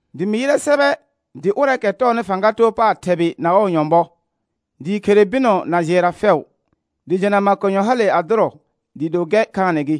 Dɩ mɩ yɩrɛ sɛbɛ dɩ ʋrɛɛkɛ tɔɔnɩ fãga too paar thɛbɩ na nyɔ̃bɔɔ, dɩɩ khere bɩnɔ na jɩɛra fɛʋ, dɩ jena makonyɔ hale a dʋrɔ dɩɩ do gɛr khaanɛ gɩ.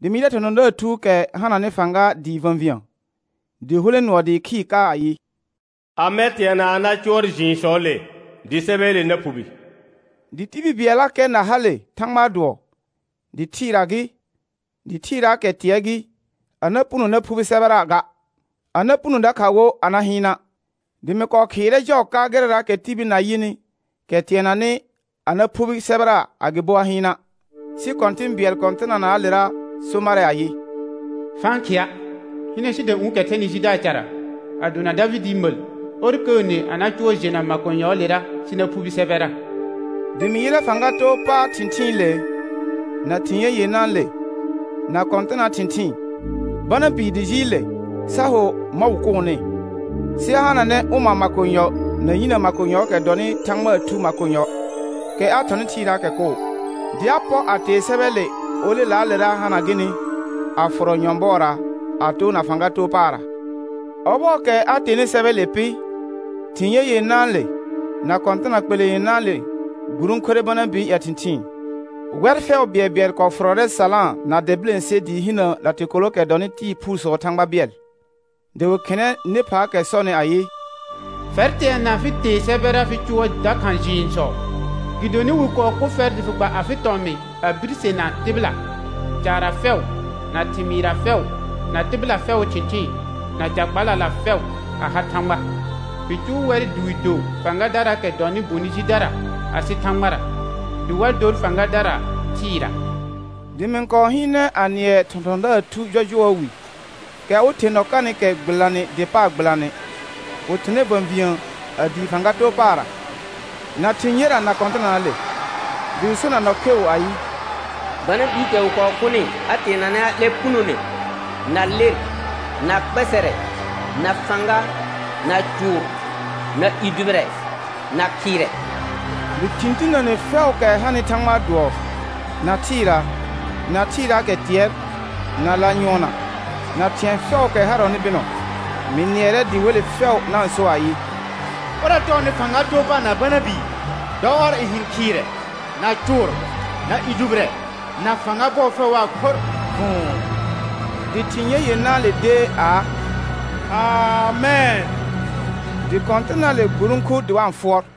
Dɩ mɩ yɩrɛ thɔ̃thɔ̃daar thuukɛ hananɩ fãga dɩɩ və̃vĩə, dɩ hulẽ nʋɔ dɩɩ khɩɩr ka ayɩ: Amɛ teana a na cʋɔr jɩɩnsɔɔle dɩ sɛbɛɛle na phubi? Dɩ tibil bɩɛllakɛ na hale Thãgbaa dʋɔ, dɩ thɩɩra gɩ, dɩ thɩɩraakɛ tɩɛr gɩ, a na puno na phubi sɛbɛra ga, a na puno dakha wo a na hɩɩna'. Dɩ mɩ kɔɔ khɩɩrɛ jɔɔ ka gɩrɛraakɛ tibil na yɩnɩ, kɛ teananɩ a na phubi sɛbɛra agɩbo a hɩɩna'. Sɩ kɔ̃tɩ̃ bɩɛl kɔ̃tɩnanaalera so marɛ ayɩ: Fa-n khɩa'. Hɩnɛ sidũ'ũukɛ thɛnɩ Judaa cara, a dona Davɩdɩɩ məl, ɔr kəəne a na cʋɔr jena makonyɔɔlera sɩ na phubi sɛbɛra. Dɩ mɩ yɩrɛ fãga too pa thɩ̃thɩɩnɩle, na thɩ̃ ye yenãale, na kɔ̃tɩnaa thɩ̃thɩɩn, Bana bii dɩ jɩɩl le sa ho mɔ̃ wɩ kʋʋnɩ, sɩ a hananɛ ʋma makonyɔ na yinə makonyɔɔkɛ dɔnɩ Thãgbaa Thu makonyɔ, kɛ a thɔnɩ thɩɩraakɛ koo. Dɩ a pɔr, a tee sɛbɛɛle olelaalera hana gɩnɩ a fʋrɔ nyɔ̃bɔɔra a toona fãga too paarra. Ɔbɔɔkɛ a teenɩ sɛbɛɛle pɩ, thɩ̃ ye yenãale, na kɔ̃tɩna kpelẽ yenãale gburõkure Bana bɩɩ ƴɛ thɩ̃thɩɩn; wɛr fɛʋ bɩɛlbɩɛl kɔɔ fʋrɔrɛ salãa na dɛ bilẽse dɩɩ hinə latɩkolookɛ dɔnɩ tɩɩ phuusɔɔ Thãgba bɩɛl. Dɩ wɩ khɩnɛ nɩ phaakɛ sɔnɩ ayɩ: Fɛr teana fɩ tee sɛbɛra fɩ cʋɔr dakha jɩɩnsɔ, gɩdonɩ wɩ kɔɔ kʋ fɛr dɩ fɩ gba afɩ tɔmɩ̃ a birsena tɩbɩla, caarra fɛʋ, na thɩmɩɩrra fɛʋ, na tɩbɩla fɛʋʋ thɩ̃thɩɩn, na ca kpalala fɛʋ a ha Thãgba. Fɩ cʋʋ wɛr dɩ wɩ do fãgadaraakɛ dɔnɩ bonɩ jidara asɩ Thãgbara, dɩ wa dor fãgadara thɩɩra. Dɩ mɩ-n kɔɔ hɩɩnɛ a nɩɛ thɔ̃thɔ̃daar thu jɔjʋɔɔ wi, kɛ awɩ ther nɔ kanɩkɛ gbɩlanɩ der paar gbɩlanɩ, wɩ thʋnɛ və̃vĩə, a dii fãga too paarra, na thɩ̃ yera na kɔ̃tɩnanaale, dɩ wɩ so na nɔ kheu ayɩ: Bana biikɛ wɩ kɔɔ kʋnɩ a teenanɛ a 'lɛ punone, na ler, na kpɛsɛrɛ, na fãga, na cʋʋr, na i dʋbɩrɛ, na khɩɩrɛ. Dɩ thɩ̃ tinəne fɛʋʋkɛ hanɩ Thãgbaa dʋɔ, na thɩɩra, na thɩɩraakɛ tɩɛr, na lanyʋɔnna, na thɩ̃ɛ fɛʋʋkɛ harɔnɩ bɩnɔ, mɩ nɩɛrɛ dɩ wele fɛʋ na-n so ayɩ: Ʋrɛ tɔɔnɩ fãga too paar na Bana bii, dɔ ɔr n hɩ̃ khɩɩrɛ, na cʋʋr, na i dʋbɩrɛ, na fãga bɔɔ fɛʋ waa khorr vʋ̃ʋ. Dɩ thɩ̃ ye yenãale dee aa: Amɛn. Dɩ kɔ̃tɩnaale gburõku dɩ wa-n fʋɔr.